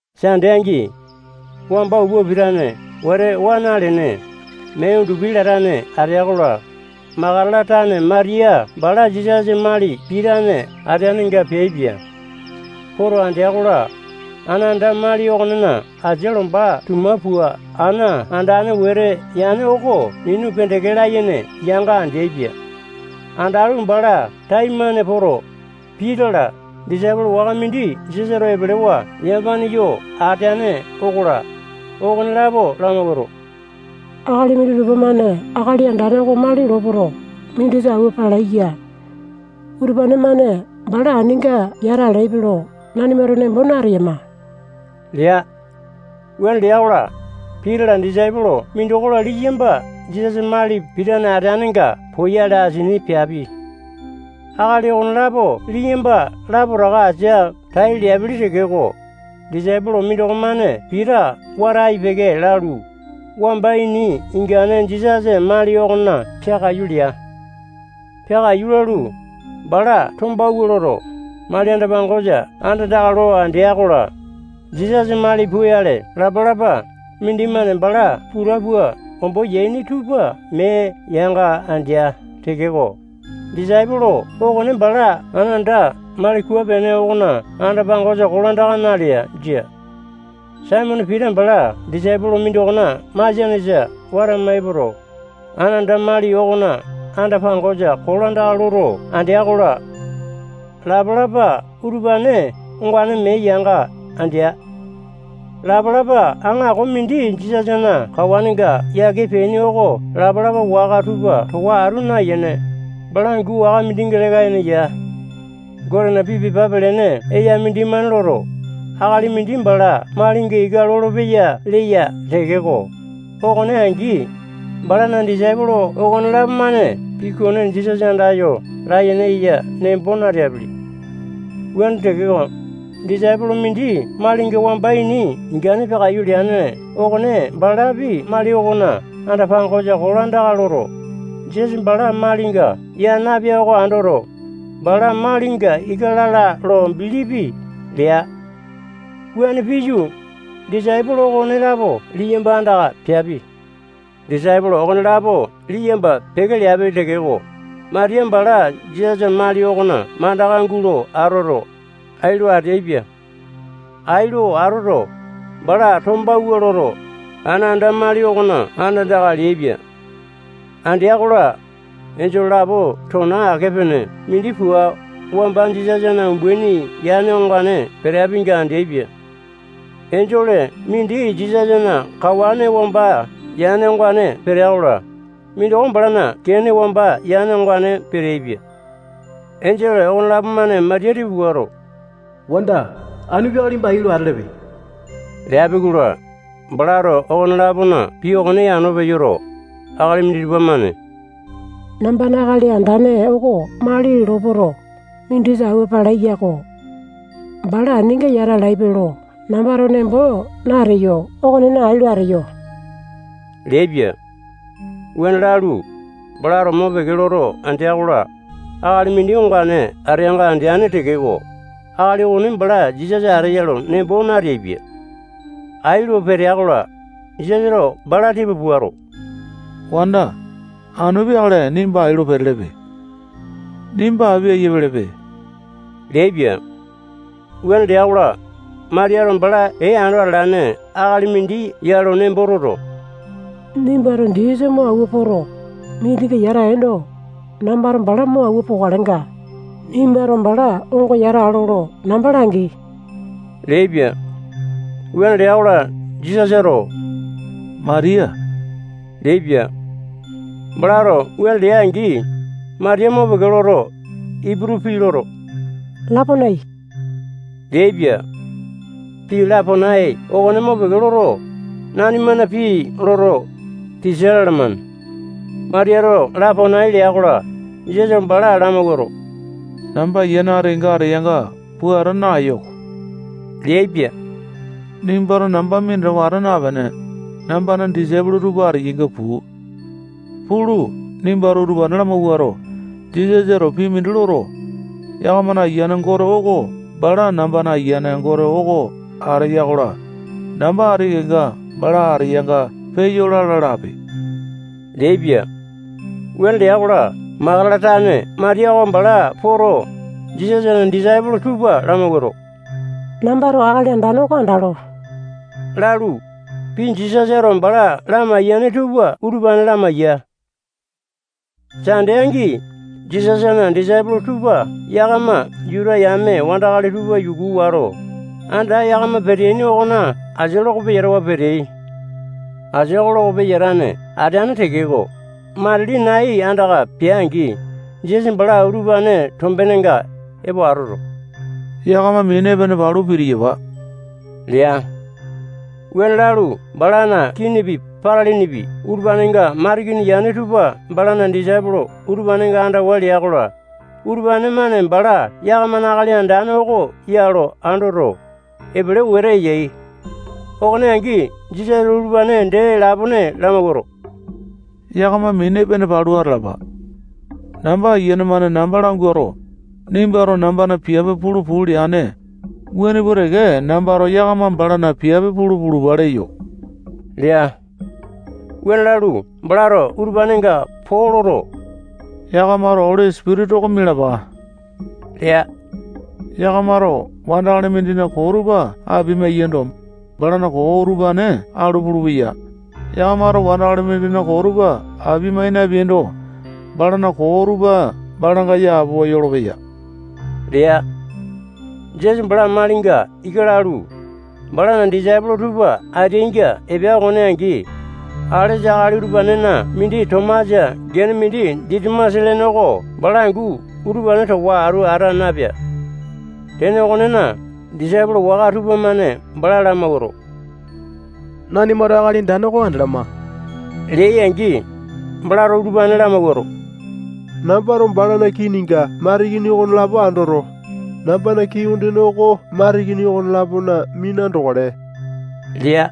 Sande angi, wamba upa pitane wete waa nalene, mee undupi latane atea-kola, Makatala tane Matiya bala Jisasa mali pitane ateanenga peaipia. Poto andea-kola, ana anda mali okonena asia lomba tuma pua ana andane wete yane oko minu pendeke layene yanga andeaipia. Andalu, bala taimane poto, Pita-la, disaipolo waka mindi Jisasato epelewa yamapane yo ateane okola, okonelapo lamawuato, akali minditupa-mane Akali Andane oko mali lopoto, mindisa awua palai ya. Utupane-mane bala aninga yata alaipe lo nanimato nembo nateyama lea. Wuane lea-kola, Pita-la, disaipolo mindoko-la, liyamba Jisasa mali pitane ateanenga poyale asini peapi. Akali okonelapo liyamba lapotaka asia tai leaipili tekeko, disaipolo mindoko-mane Pita wata ai-peke lalu, wamba ini ingane Jisasana mali okona peakaiyu lea. Peakaiyu lalu, bala tombawua loto, mali anda-pangosa andandaka lo andea-kola, Jisasa mali puyale lapa-lapa mindimane bala puta pua ombo yaini tupa mee yanga andea tekeko, disaipolo okone bala ana anda mali kua-pene okona anda-pangosa kolandaka nalea. Jia. Saimone Pita bala disaipolo mindokona masianesa watama epoto, ana anda mali okona anda-pangosa kolandaka loto andea-kola, lapa-lapa utupane ongane mee yanga andea. Lapa-lapa aŋako mindi Jisasana kawanenga yake peaini oko lapa-lapa waka tupa towa atu nayene, bala angu waka mindinga leka yene ya. Gotena pii pepa pelene eya mindimane loto, akali mindi bala malinga ika lolopeya leya tekeko, okone angi, balana disaipolo okonelapo-mane pii okone Jisasa andayo layene eya nembo nateapili. Wuane tekeko, disaipolo mindi malinga wamba ini ingane peakaiyu leane okone balapi mali okona anda-pangosa kolandaka loto, Jisasa bala malinga yaa napea oko andoto, bala malinga ika lala lo bilipi lea. Wuane piyu, disaipolo okonelapo liyamba andaka peapi. Disaipolo okonelapo liyamba peke leapi tekeko, Matiya bala Jisasana mali okona mandaka gulo atoto, ai lo ateaipia. Ai lo atoto, bala tombawua loto, ana anda mali okona andandaka leaipia. Andea-kola, enjole lapo tona ake-pene mindi pua wamba Jisasana umbaini yane ongane peteapinga andeaipia. Enjole mindi Jisasana kawane wamba yane ongane petea-kola, mindoko balana kene wamba yane ongane peteaipia. Enjole okonelapo-mane Matiya tipa puato, wanda, anu peakale nimba ai lo atelepe leapi-kola, balato okone-lapona pii okone yano peyoto, akali minditupa-mane nambana Akali Andane oko mali lopoto, mindisa awua palai yako. Bala aninga yata alaipe lo nambato nembo nateyo okonena, ai lo ateyo leaipia. Wuane lalu, balato mopeke loto andea-kola, akali mindi ongane ateanga andeane tekeko, akali okone bala Jisasa ateya nembo nateaipia. Ai lo petea-kola, Jisasato bala tipa puato, wanda, anu peakale nimba ai lo petelepe. Nimba api ayia pelepe leaipia. Wuane lea-kola, Matiyato bala ee ando atalane akali mindi ya lo nembo toto, nimbato Jisasa mo awua poto, mindinga yata ale yando, nambato bala mo awua pokalenga, nimbato bala onga yata alo lo namba langi leaipia. Wuane lea-kola, Jisasato Matiya leaipia. Balato wuane leane-angi, Matiya mopeke loto, Iputu pii loto, Laponai leaipia. Pii Laponai okone mopeke loto, nanimana pii loto, tisa lalamane. Matiyato Laponai lea-kola, Jisasato bala lamawuato, namba Ayiane ati kenga ateyanga puata naeyo-ko leaipia. Nimbato namba minatawa ata napene, nambana disaipolo tupa ateyainga puu. Pulu, nimbato utupane lamawuato, Jisasato pii mindi loto, yakamana Ayiane Gote oko bala nambana Ayiane Gote oko ateya-kola, namba ati kenga bala ateyanga peyo lala lape leaipia. Wuane lea-kola, Makatala tane Matiya oko bala poto, Jisasana disaipolo tupa lamawuato, nambato Akali Andane oko andalo lalu, pii Jisasato bala lamaiyane tupa utupane lamaiya. Sande angi, Jisasana disaipolo tupa yakama Juta yame wandakali tupa yuku wato, anda yakama peteaini okona asia loko peyatawa peteai. Asia oko loko peyatane ateane tekeko, matili nai andaka pea-angi, Jisasa bala utupane tombenenga epo atoto, yakama mini epene palu pitiyapa lea. Wuane lalu, balana kinipi, patalinipi, utupanenga matikini yane tupa balana disaipolo utupanenga andawa lea-kola, utupane-mane bala yakamana Akali Andane oko ya lo andoto, epele wete yai. Okone angi, Jisasato utupane dee lapone lamawuato, yakama mini epene palu atalapa. Namba ayiane-mane namba languato, nimbato nambana piape pulu puu leane, wuane pua teke nambato yakama balana piape pulu pulupa leyo lea. Wuane lalu, balato utupanenga poo loto, yakamato Oli Sipitisa oko mialapa lea. Yakamato wandakali mindina koo tupa apia-mayiando, balana koo utupane alu pulupeyai. Yakamato wandakali mindina koo tupa apia-mai napeaindo, balana koo tupa balanga yapowa yolopeya lea. Jisasa bala malinga ika lalu, balana disaipolo tupa ateainga epea okone angi, alesa akali utupanena mindi Tomasa gene mindi Ditimasa lene oko bala angu utupane towa atu ata napea. Tene okonena, disaipolo waka tupamane bala lamawuato, nanimato Akali Andane oko andalama leai-angi, balato utupane lamawuato, nambato balana kininga matikini okonelapo andoto, nambana kii ondene oko matikini okone-lapona mina andokale lea.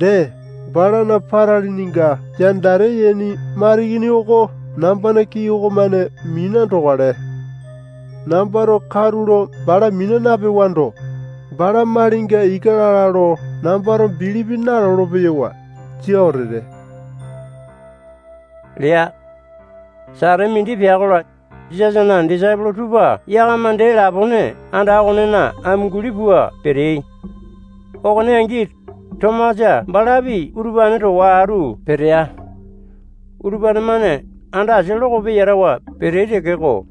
Dee, balana patalininga yandate yaini matikini oko nambana kii okomane mina andokale. Nambato katulo bala mina napewando, bala malinga ika lala lo nambato bilipi nalolo-peyo. Jia wete lea. Satete mindi pea-kola, Jisasana disaipolo tupa yakama dee lapone anda okonena amunguli pua peteai. Okone angi, Tomasa balapi utupane towa atu petea. Utupane-mane anda asia loko peyatawa peteai tekeko,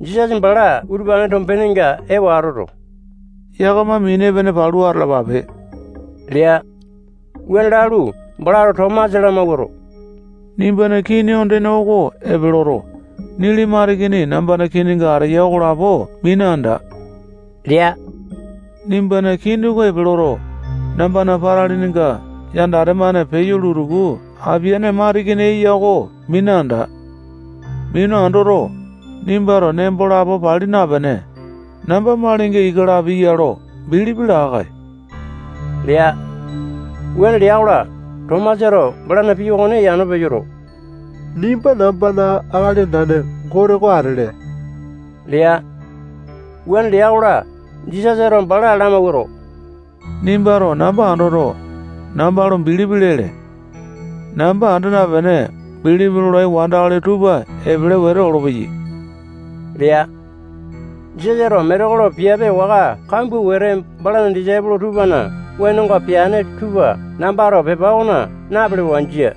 Jisasa bala utupane tombenenga epo atoto, yakama mini epene palu atalapape lea. Wuane lalu, balato Tomasa lamawuato, nimbana kii ondene oko epe loto, nili matikini nambana kininga ateya okolapo mina anda lea. Nimbana kini oko epe loto, nambana patalininga yandate-mane peyo lutuku apaene matikini eya oko mina anda. Mina andoto, nimbato nembo lapo pali napene, namba malinga ika lapi ya lo bilipi laa-kae lea. Wuane lea-kola, Tomasato balana pii okone yano peyoto, nimba nambana Akali Andane Gote oko atele lea. Wuane lea-kola, Jisasato bala lamawuato, nimbato namba andoto, namba lo bilipi lele. Namba anda napene, bilipi lolai wandakali tupa epele wete olopeyai lea. Jisasato metekolo piape waka kambua wete balana disaipolo tupana wenonga peane tupa nambato pepa okona napelewa. Jia.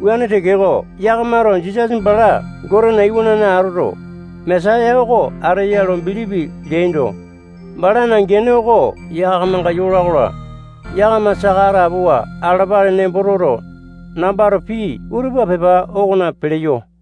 Wuane tekeko, yakamato Jisasa bala Gotena Iwanane atoto, Mesaya oko ateya lo bilipi leaindo, balana gene oko yakamanga yola-kola, yakama saka atapowa atalapale nembo toto, nambato pii utupa pepa okona peleyo.